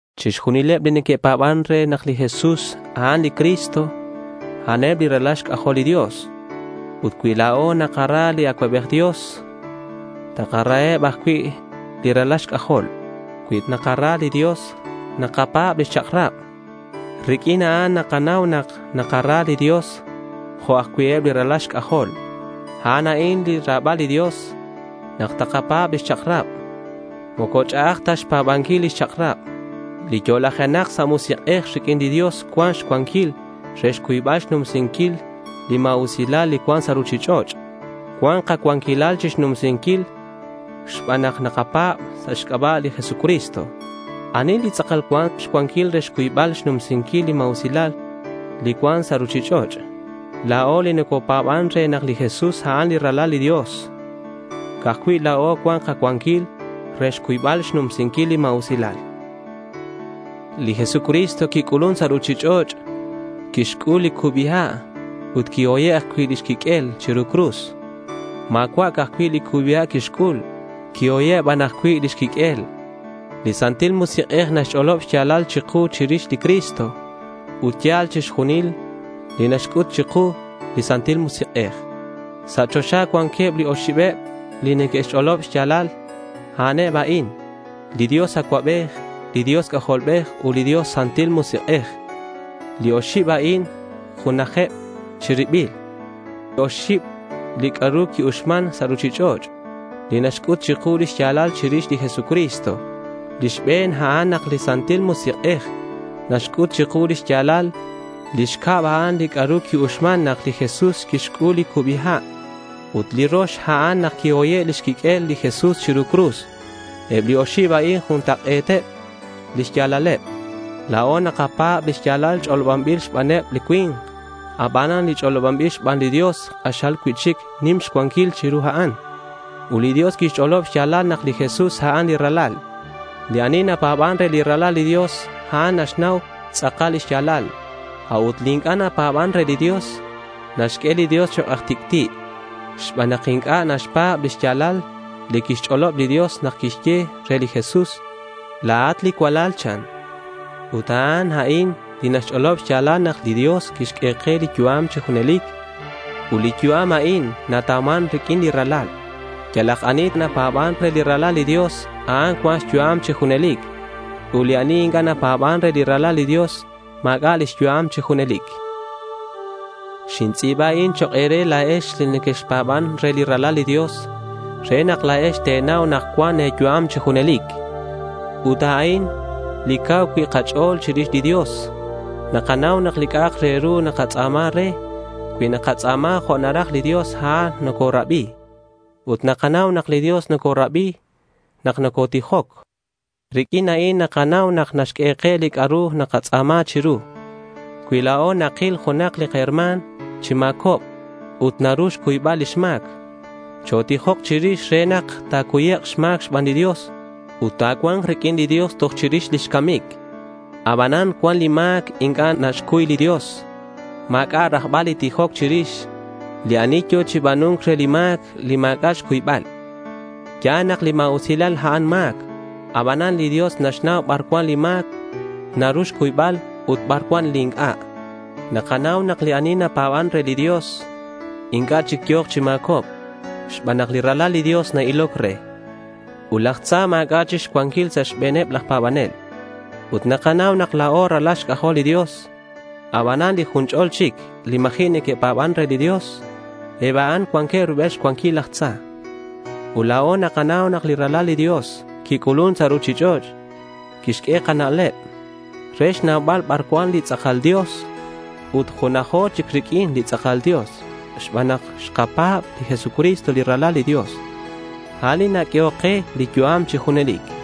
Chixjunileb li neque'pa̱ban re nak li Jesús a'an li Cristo, a'aneb li ralal xc'ajol li Dios. Ut cui la̱o nakara li Acuabej Dios, takaraheb ajcui' li ralal xc'ajol. Cui nakara li Dios, nakapa̱b lix chak'rab. Riq'uin a'an nakanau nak nakara li Dios jo' ajcui' eb li ralal xc'ajol. A'an a'in lix ra̱bal li Dios: nak takapa̱b lix chak'rab. Moco ch'a'aj ta xpa̱banquil lix chak'rab. Li yo'lajenak sa' musik'ej riq'uin li Dios cuan xcuanquil re xcuybal xnumsinquil li ma̱usilal li cuan sa' ruchich'och'. Cuan kacuanquilal chixnumsinquil xban nak nakapa̱b sa' xc'aba' li Jesucristo. ¿Ani li tz'akal cuan xcuanquil re xcuybal xnumsinquil li ma̱usilal li cuan sa' ruchich'och'? La̱o li nocopa̱ban re nak li Jesús a'an li Ralal li Dios. Ca'aj cui' la̱o cuan kacuanquil re xcuybal xnumsinquil li ma̱usilal. Li Jesucristo quic'ulun sa' ruchich'och'. Quixc'ul li cubi ha' ut quihoye' ajcui' lix quiq'uel chiru li cruz. Ma̱cua' ca'aj cui' li cubi ha' quixc'ul. Quihoye' aj ban cui' lix quiq'uel. Li Santil Musik'ej naxch'olob xya̱lal chiku chirix li Cristo. Ut ya̱l chixjunil li naxc'ut chiku li Santil Musik'ej. Sa' choxa cuanqueb li oxibeb li neque'ch'oloban lix ya̱lal. A'aneb a'in: li Dios Acuabej, li Dios C'ajolbej ut li Dios Santil Musik'ej. Li oxib a'in junajeb chi ribil. Ut oxib li c'a'ru qui-uxman sa' ruchich'och' li naxc'ut chiku lix ya̱lal chirix li Jesucristo. Li xbe̱n, a'an nak li Santil Musik'ej naxc'ut chiku lix ya̱lal. Li xcab, a'an li c'a'ru qui-uxman nak li Jesús quixc'ul li cubi ha'. Ut li rox, a'an nak quihoye' lix quiq'uel li Jesús chiru cruz. Eb li oxib a'in juntak'e̱t lix ya̱laleb. La̱o nakapa̱b li ya̱l ch'olobanbil xbaneb li cui̱nk. Abanan li ch'olobanbil xban li Dios k'axal cui'chic nim xcuanquil chiru a'an. Ut li Dios quixch'olob xya̱lal nak li Jesús a'an li Ralal. Li ani napa̱ban re li Ralal li Dios, a'an naxnau tz'akal lix ya̱lal. A'ut li inc'a' napa̱ban re li Dios, naxq'ue li Dios chok' aj tic'ti' xban nak inc'a' naxpa̱b li xya̱lal li quixch'olob li Dios nak quixye re li Jesús: La̱at li cualal, chan. Ut a'an a'in li naxch'olob xya̱lal nak li Dios quixq'ue ke li yu'am chi junelic. Ut li yu'am a'in natauman riq'uin li Ralal. Yalak ani napa̱ban re li Ralal li Dios, a'an cuan xyu'am chi junelic. Ut li ani inc'a' napa̱ban re li Ralal li Dios, ma̱c'a' lix yu'am chi junelic. Xintz'i̱ba a'in chok' e̱re la̱ex li nequexpa̱ban re li Ralal li Dios re nak la̱ex te̱nau nak cuan e̱yu'am chi junelic. Ut a'in li cau cui' kach'o̱l chirix li Dios. Nakanau nak li c'a'ak re ru nakatz'a̱ma re, cui nakatz'a̱ma jo' naraj li Dios, a'an nocorabi. Nakanau nak li Dios nocorabi nak nocotijoc. Riq'uin a'in nakanau nak naxq'ue ke li c'a'ru nakatz'a̱ma chiru. Cui la̱o takil junak li kaherma̱n chi ma̱cobc ut naru xcuybal lix ma̱c, chotijok chirix re nak ta̱cuyek' xma̱c xban li Dios ut ta̱cua̱nk riq'uin li Dios toj chirix lix camic. Abanan cuan li ma̱c inc'a' naxcuy li Dios. Ma̱c'a' rajbal li tijoc chirix li ani yo̱ chi ba̱nu̱nc re li ma̱c li ma̱c'a' xcuybal. Ya̱l nak li ma̱usilal, a'an ma̱c. Abanan li Dios naxnau bar cuan li ma̱c naru xcuybal ut bar cuan li inc'a'. Nakanau nak li ani napa̱ban re li Dios inc'a' chic yo̱k chi ma̱cobc xban nak li Ralal li Dios na-iloc re. Ut laj tza ma̱c'a' chic xcuanquil sa' xbe̱n laj pa̱banel. Ut nakanau nak la̱o ralal xc'ajol li Dios. Abanan li jun ch'o̱l chic li ma̱ji' neque'pa̱ban re li Dios, eb a'an cuanqueb rubel xcuanquil laj tza. Ut la̱o nakanau nak li Ralal li Dios quic'ulun sa' ruchich'och'. Quixq'ue kana'leb re xnaubal bar cuan li tz'akal Dios. Ut junajo chic riq'uin li tz'akal Dios xban nak xkapa̱b li Jesucristo li Ralal li Dios. A'an li naq'uehoc ke li yu'am chi junelic.